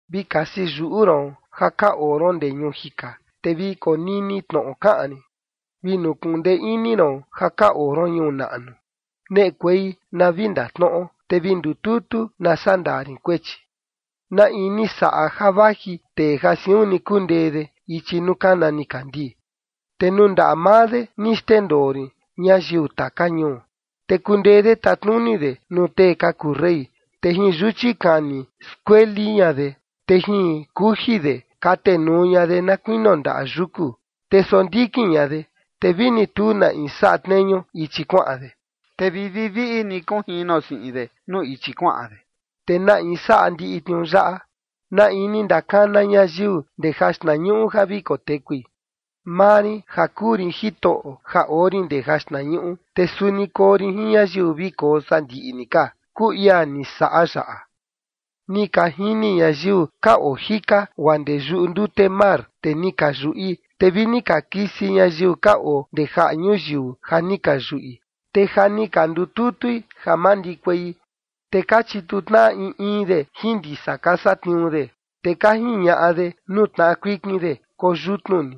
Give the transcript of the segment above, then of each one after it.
Vi kasi yuꞌu ron ja ka oo ron ndee ñuu jika, te vi konini tnoꞌo kaꞌan rin: Vi nukuꞌun ndee ini ron ja ka oo ron ñuu naꞌnu, neꞌekuei na vi ndatnoꞌo, te vi ndututu, na sandaa rin kuechi. ¿Na in ni saꞌa ja vaji tee ja siun ni kundee de ichi nuu kana nikandii? Te nuu ndaꞌa maa de ni xndendoo rin ñayiu taka ñuu, te kundee de tatnuni de nuu tee ka kuu rey, te jin yuchi kani skueli ña de, te jin kuji de katenuu ña de na kuinio ndaꞌa yuku. Te sondikin ña de, te vini tu na in saꞌa tneñu ichi kuaꞌan de, te vi viviꞌi ni kunjino siꞌin de nuu ichi kuaꞌan de. ¿Te na in saꞌa ndiꞌi tniuu yaꞌa? ¿Na in ni ndakana ñayiu ndee jaxtnañuꞌu ja vi kotekui? Maa rin ja kuu rin Jitoꞌo, ja oo rin ndee jaxtnañuꞌu, te suni koo rin jin ñayiu vi koo sandiꞌi ni ka, kuu ia ni saꞌa yaꞌa. Ni ka jini ñayiu ka oo jika, guaa ndee yuꞌu ndute mar, te ni ka yuꞌi, te vi ni ka kisi ñayiu ka oo ndee jaꞌa ñuyiu ja ni ka yuꞌi, te ja ni ka ndututui ja mandikuei. Te ka chituu tnaꞌa in in de jin ndisa ka satniuu de, te ka jiñaꞌa de nuu tnaꞌa kuikin de: “Koo yutnu ni”.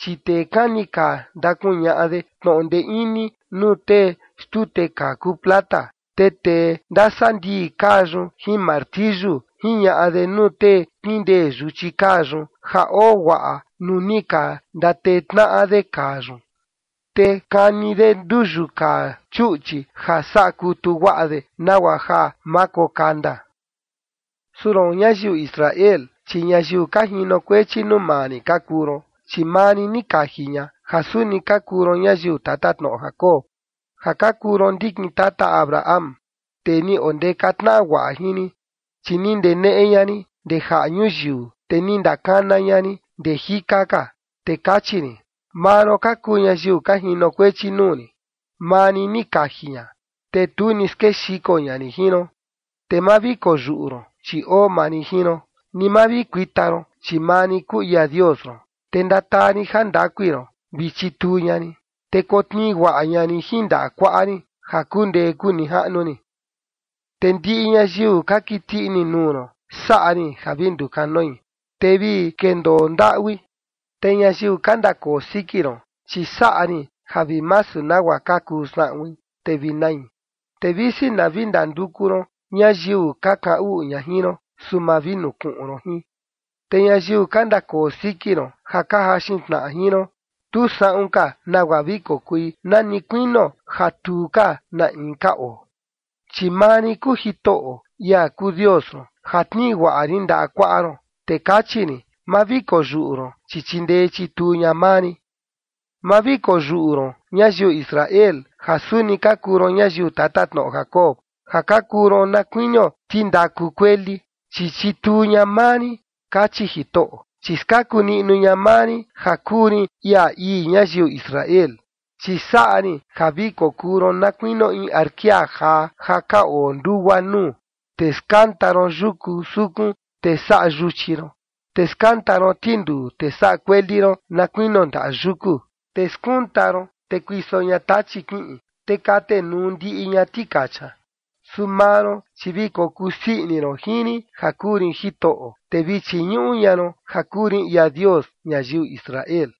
Chi tee kani kaa ndakuñaꞌa de tnoꞌo ndee ini nuu tee xtute kaa kuu plata, te tee ndasandii kaa yun jin martiyu jiñaꞌa de nuu tee kindee yuchi kaa yun ja oo guaꞌa nuu ni ka ndatee tnaꞌa de kaa yun, te kani de nduyu kaa chuꞌchi ja saꞌa kutu guaꞌa de nagua ja ma kokanda. Su roon, ñayiu Israel, chi ñayiu ka jinokuechi nuu maa rin ka kuu ron, chi maa rin ni kaji ña, ja suni ka kuu ron ñayiu tatatnoꞌo Jacob, ja ka kuu ron ndikin tata Abraham, tee ni ondeka tnaꞌa guaꞌa jin rin. Chi ni ndeneꞌe ña rin ndee jaꞌa ñuyiu, te ni ndakana ña rin ndee jika ka, te kachi rin: “Maa ron ka kuu ñayiu ka jinokuechi nuu rin”. Maa rin ni kaji ña, te tu ni skexiko ña rin jin ron. Te ma vi koyuꞌu ron, chi oo maa rin jin ron, ni ma vi kuita ron, chi maa rin kuu ia Dios ron, te ndataa rin jandakui ron, vi chituu ña rin, te kotnii guaꞌa ña rin jin ndaꞌa kuaꞌa rin, ja kundee kunijaꞌnu rin. Te ndiꞌi ñayiu ka kiti ini nuu ron saꞌa rin ja vi ndukanoi, te vi kendoo ndaꞌui. Te ñayiu ka ndakoo siki ron, chi saꞌa rin ja vi masu nagua ka kuu saꞌuin, te vi nai. Te visi na vi ndanduku ron ñayiu ka kaꞌan uꞌu ña jin ron, su ma vi nukuꞌun ron jin. Te ñayiu ka ndakoo siki ron ja ka jaxin tnaꞌa jin ron, tu saꞌun ka nagua vi kokui nani kuinio ja tu ka na in ka oo. Chi maa rin kuu Jitoꞌo, ia kuu Dios ron, ja tnii guaꞌa rin ndaꞌa kuaꞌa ron, te kachi rin: “Ma vi koyuꞌu ron, chi chindee chituu ña maa rin”. ’Ma vi koyuꞌu ron ñayiu Israel ja suni ka kuu ron ñayiu tatatnoꞌo Jacob, ja ka kuu ron na kuinio tindaku kueli, chi chituu ña maa rin, kachi Jitoꞌo, chi skaku niꞌnu ña maa rin ja kuu rin ia ii ñayiu Israel. Chi saꞌa rin ja vi kokuu ron na kuinio in arkia jaa ja ka oo ndugua nuu, te skanta ron yuku sukun, te saꞌa yuchi ron, te skanta ron tinduu, te saꞌa kueli ron na kuinio ndaꞌa yuku. Te skunta ron, te kuiso ña tachi kiꞌin, te katenuu ndiꞌi ña tikacha. Su maa ron, chi vi kokuu sii ini ron jin rin ja kuu rin Jitoꞌo. Te vi chiñuꞌu ña ron ja kuu rin ia Dios ñayiu Israel.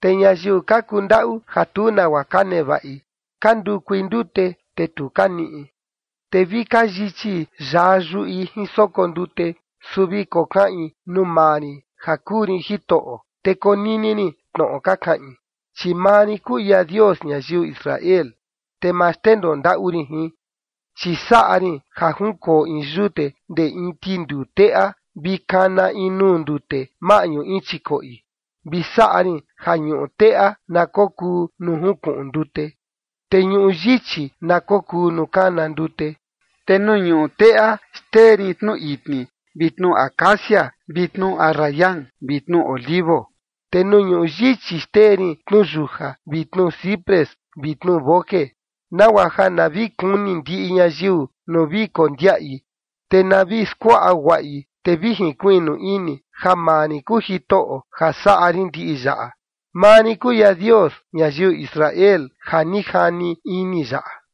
Te ñayiu ka kundaꞌu ja tu nagua ka nevaꞌi, ka ndukui ndute, te tu ka niꞌi, te vi ka yichi yaa yuꞌi jin soko ndute. Su vi kokaꞌin nuu maa rin ja kuu rin Jitoꞌo, te konini rin tnoꞌo ka kaꞌin, chi maa rin kuu ia Dios ñayiu Israel, te ma xndendoo ndaꞌu rin jin. Chi saꞌa rin ja junkoo in yute ndee in tinduu teꞌa vi na kana in nuu ndute maꞌñu in chikoꞌi, vi saꞌa rin ja ñuꞌu teꞌa na kokuu nuu junkuꞌun ndute, te ñuꞌu yichi na kokuu nuu kana ndute. Te nuu ñuꞌu teꞌa, xtee rin tnu itni vi tnu acacia vi tnu arrayan vi tnu olivo, te nuu ñuꞌu yichi xtee rin tnuyuja vi tnuciprés vi tnuboje, nagua ja na vi kuni ndiꞌi ñayiu nuu vi kondiaꞌi, te na vi skuaꞌa guaꞌi, te vi jinkuiꞌnu ini ja maa rin kuu Jitoꞌo, ja saꞌa rin ndiꞌi yaꞌa, maa rin kuu ia Dios ñayiu Israel ja ni jani ini yaꞌa.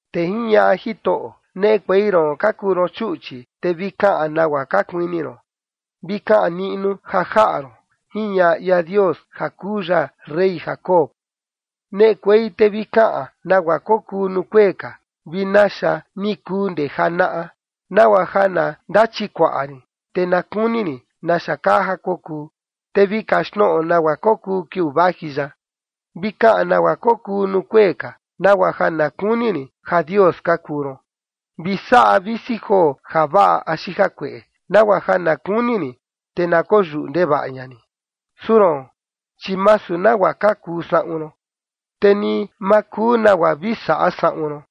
Te jiñaꞌa Jitoꞌo: “Neꞌekuei ron ka kuu ron chuꞌchi, te vi kaꞌan nagua ka kuini ron, vi kaꞌan niꞌnu ja jaꞌa ron”, jiñaꞌa ia Dios ja kuu ya rey Jacob. “Neꞌekuei te vi kaꞌan nagua kokuu nuu kuee ka vi naxa ni kuu ndee janaꞌa, nagua ja na ndachikuaꞌa rin, te na kuni rin naxa kaa ja kokuu, te vi kaxtnoꞌo nagua kokuu kiuu vaji yaꞌa. Vi kaꞌan nagua kokuu nuu kuee ka, nagua ja na kuni rin ja dios ka kuu ron. Vi saꞌa visi joo javaꞌa axi jakueꞌe, nagua ja na kuni rin, te na koyuꞌu ndevaꞌa ña rin. Su roon, chi masu nagua ka kuu saꞌun ron, te ni ma kuu nagua vi saꞌa saꞌun ron.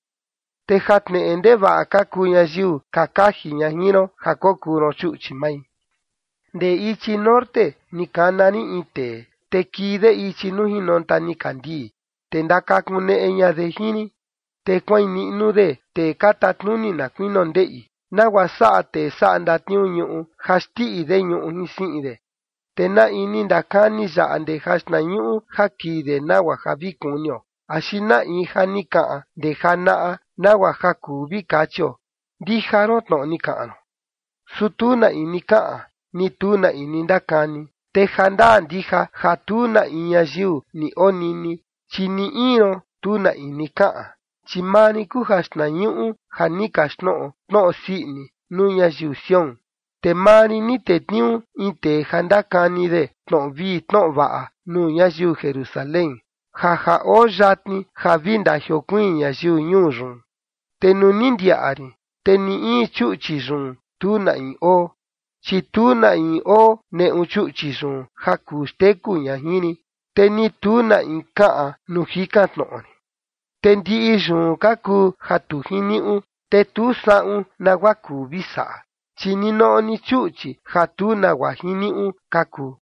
Te ja tneꞌe ndevaꞌa ka kuu ñayiu ka kaji ña jin ron ja kokuu ron chuꞌchi mai. ’Ndee ichi norte ni kana rin in tee, te kii de ichi nuu jinonta nikandii, te ndakakuneꞌe ña de jin rin, te kuain niꞌnu de tee ka tatnuni na kuinio ndeꞌi, nagua saꞌa tee saꞌa ndatniuu ñuꞌu ja xtiꞌi de ñuꞌu jin siꞌin de. ¿Te na in ni ndakani yaꞌa ndee jaxtnañuꞌu ja kii de, nagua ja vi kunio, axi na in ja ni kaꞌan ndee janaꞌa nagua ja kuu vi kachio: Ndija ron tnoꞌo ni kaꞌan ron? Su tu na in ni kaꞌan, ni tu na in ni ndakani, te jandaa ndija ja tu na in ñayiu ni onini, chi ni in ron, tu na in ni kaꞌan. Chi maa rin kuu jaxtnañuꞌu ja ni kaxtnoꞌo tnoꞌo sii ini nuu ñayiu Sión, te maa rin ni tetniuu in tee ja ndakani de tnoꞌo vii tnoꞌo vaꞌa nuu ñayiu Jerusalén, ja ja oo yatni ja vi ndajiokuiin ñayiu ñuu yun. Te nuu ni ndiaꞌa rin, te ni in chuꞌchi yun tu na in oo, chi tu na in oo neꞌu chuꞌchi yun ja kuu xteku ña jin rin, te ni tu na in kaꞌan nuu jikan tnoꞌo rin. Te ndiꞌi yun ka kuu ja tu jiniuꞌu, te tu saꞌun nagua kuu vi saꞌa, chi ninoꞌo ni chuꞌchi ja tu nagua jiniuꞌu ka kuu.”